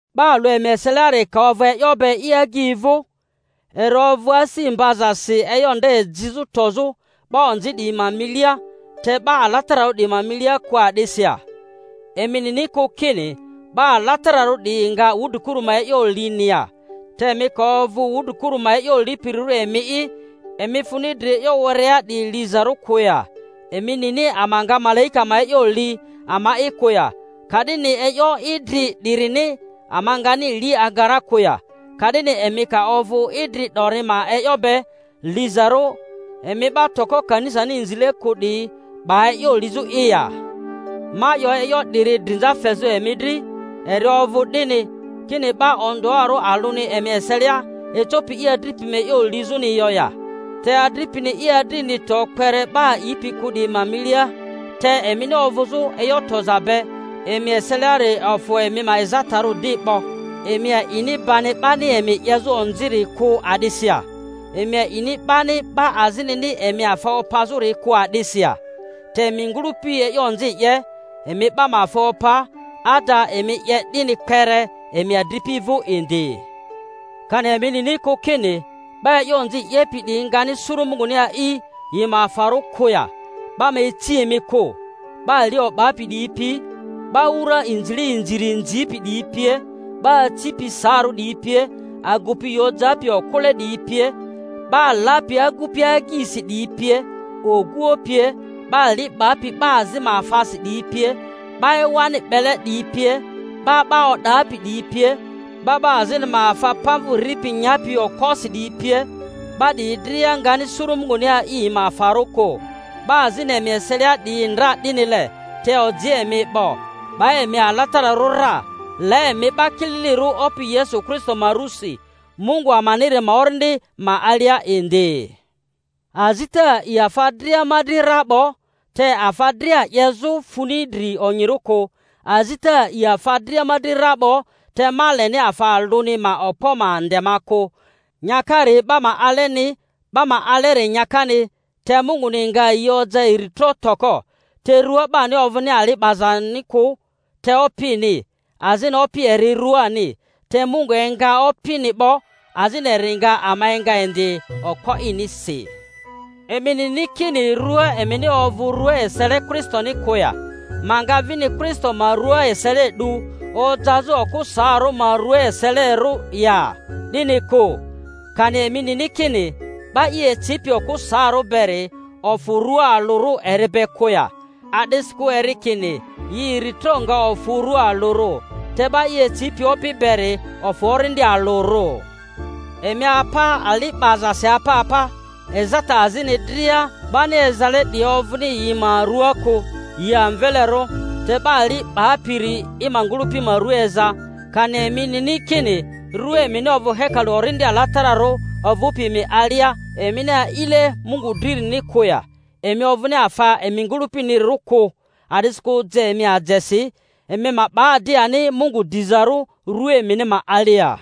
'Ba alᴜ emi eseliari ka ovᴜ e'yo be i agyi vᴜ, eri ovᴜ asi mbazasi e'yo nde jizᴜ tozᴜ 'ba onzi 'diyi ma milia, te 'ba alatararᴜ 'diyi ma milia kᴜ a'disi ya? Emi nini kᴜ kini 'ba alatararᴜ 'diyi nga wudrikuru ma e'yo lini ya? Te emi ka ovᴜ wudri-kuru ma e'yo lipirirᴜ emi'i, emi funi dri e'yo werea 'diyi lizarᴜ kᴜ ya? Emi nini ama nga malaika ma e'yo li ama'i kᴜ ya? Ka'dini e'yo idri 'dirini ama ngani li aga ra kᴜ ya? Ka'dini emi ka ovᴜ idri 'dori ma e'yo be lizarᴜ, emi 'ba toko kanisani inzile kᴜ 'diyi 'ba e'yo lizᴜ'i ya? Ma 'yo e'yo 'diri drinza fezᴜ emi dri. Eri ovᴜ 'dini, kini 'ba ondᴜarᴜ alᴜni emi eselia ecopi i adripi ma e'yo lizᴜni yo ya? Te adripini i adrini to kpere 'ba a'ipi kᴜ 'diyi ma milia. Te emini ovᴜzᴜ e'yo toza be emi eseliari ofᴜ emi ma ezatarᴜ di 'bo. Emi a'ini bani 'bani emi 'yezᴜ onziri kᴜ a'disi ya? Emi a'ini bani 'ba azinini emi afa opazᴜri kᴜ a'disi ya? Te emi ngᴜlᴜpi e'yo onzi 'ye, emi 'ba ma afa opa, ada emi 'ye 'dini kpere emi adripi vᴜ indi. Kani emi nini kᴜ kini, 'ba e'yo onzi 'yepi 'diyi ngani suru Munguni a'i yi ma afarᴜ kᴜ ya? 'Ba ma ici emi kᴜ; 'ba ali o'bapi 'diyi pi, 'ba wura inzile inziri inzipi 'diyi pie, 'ba acipi saarᴜ 'diyi pie, agupi i ojapi okᴜle 'diyi pie, 'ba lapi agupi agyisi 'diyi pie, oguoᴜ pie, 'ba li 'bapi 'ba azi ma afasi 'diyi pie, 'ba ewani 'bele 'diyi pie, 'ba 'ba o'dapi 'diyi pie, 'ba 'ba azini ma afa pamvᴜ ripi nyapi okposi 'diyi pie, 'ba 'diyi dria ngani suru Munguni a'i yi ma afarᴜ kᴜ. 'Ba azini emi eselia 'diyi ndra 'dinile. Te oji emi 'bo, 'ba emi alatararᴜ ra, la emi 'ba kililirᴜ Opi Yesu Kristo ma rusi, Mungu amaniri ma Orindi ma alia indi. Azita a'i afa dria ma dri ra 'bo, te afa dria 'yezᴜ funi dri onyirᴜ kᴜ. Azita a'i afa dria ma dri ra 'bo, te ma leni afa alᴜni ma okpo ma nde ma kᴜ. Nyakari 'ba ma aleni, 'ba ma aleri nyakani—te Munguni nga yi oja iri tro toko. Te rua 'bani ovᴜni ali 'bazani kᴜ, te Opini, azini Opi eri ruani. Te Mungu enga Opini 'bo, azini eri nga ama enga indi okpo inisi. Emi nini kini rᴜa emin i ovᴜ rᴜa esele Kristoni kᴜ ya? Ma nga vini Kristo ma rua esele 'du ojazᴜ okᴜ saarᴜ ma rua eselerᴜ ya? 'Dini kᴜ! Kani emi nini kini 'ba i ecipi okᴜ saarᴜ beri ofᴜ rua alᴜrᴜ eri be kᴜ ya? A'disikᴜ eri kini, Yi iri tro nga ofᴜ rua alᴜrᴜ. Te 'ba i ecipi Opi beri ofᴜ orindi alᴜrᴜ. Emi apa ali 'bazasi apa apa. Ezata azini dria 'bani ezale 'diyi ovᴜni yi ma rᴜaa kᴜ, yi amvelerᴜ; te 'ba ali 'bapiri i ma ngᴜlᴜpi ma rua eza. Kani emi nini kini rua emini ovᴜ hekalu Orindi Alatararᴜ ovᴜpi emi alia, emini a'ile Mungu dririni kᴜ ya? Emi ovᴜni afa emi ngᴜlᴜpinirᴜ kᴜ; a'disikᴜ je emi ajesi. Emi ma 'ba di ani Mungu dizarᴜ rᴜa emini ma alia.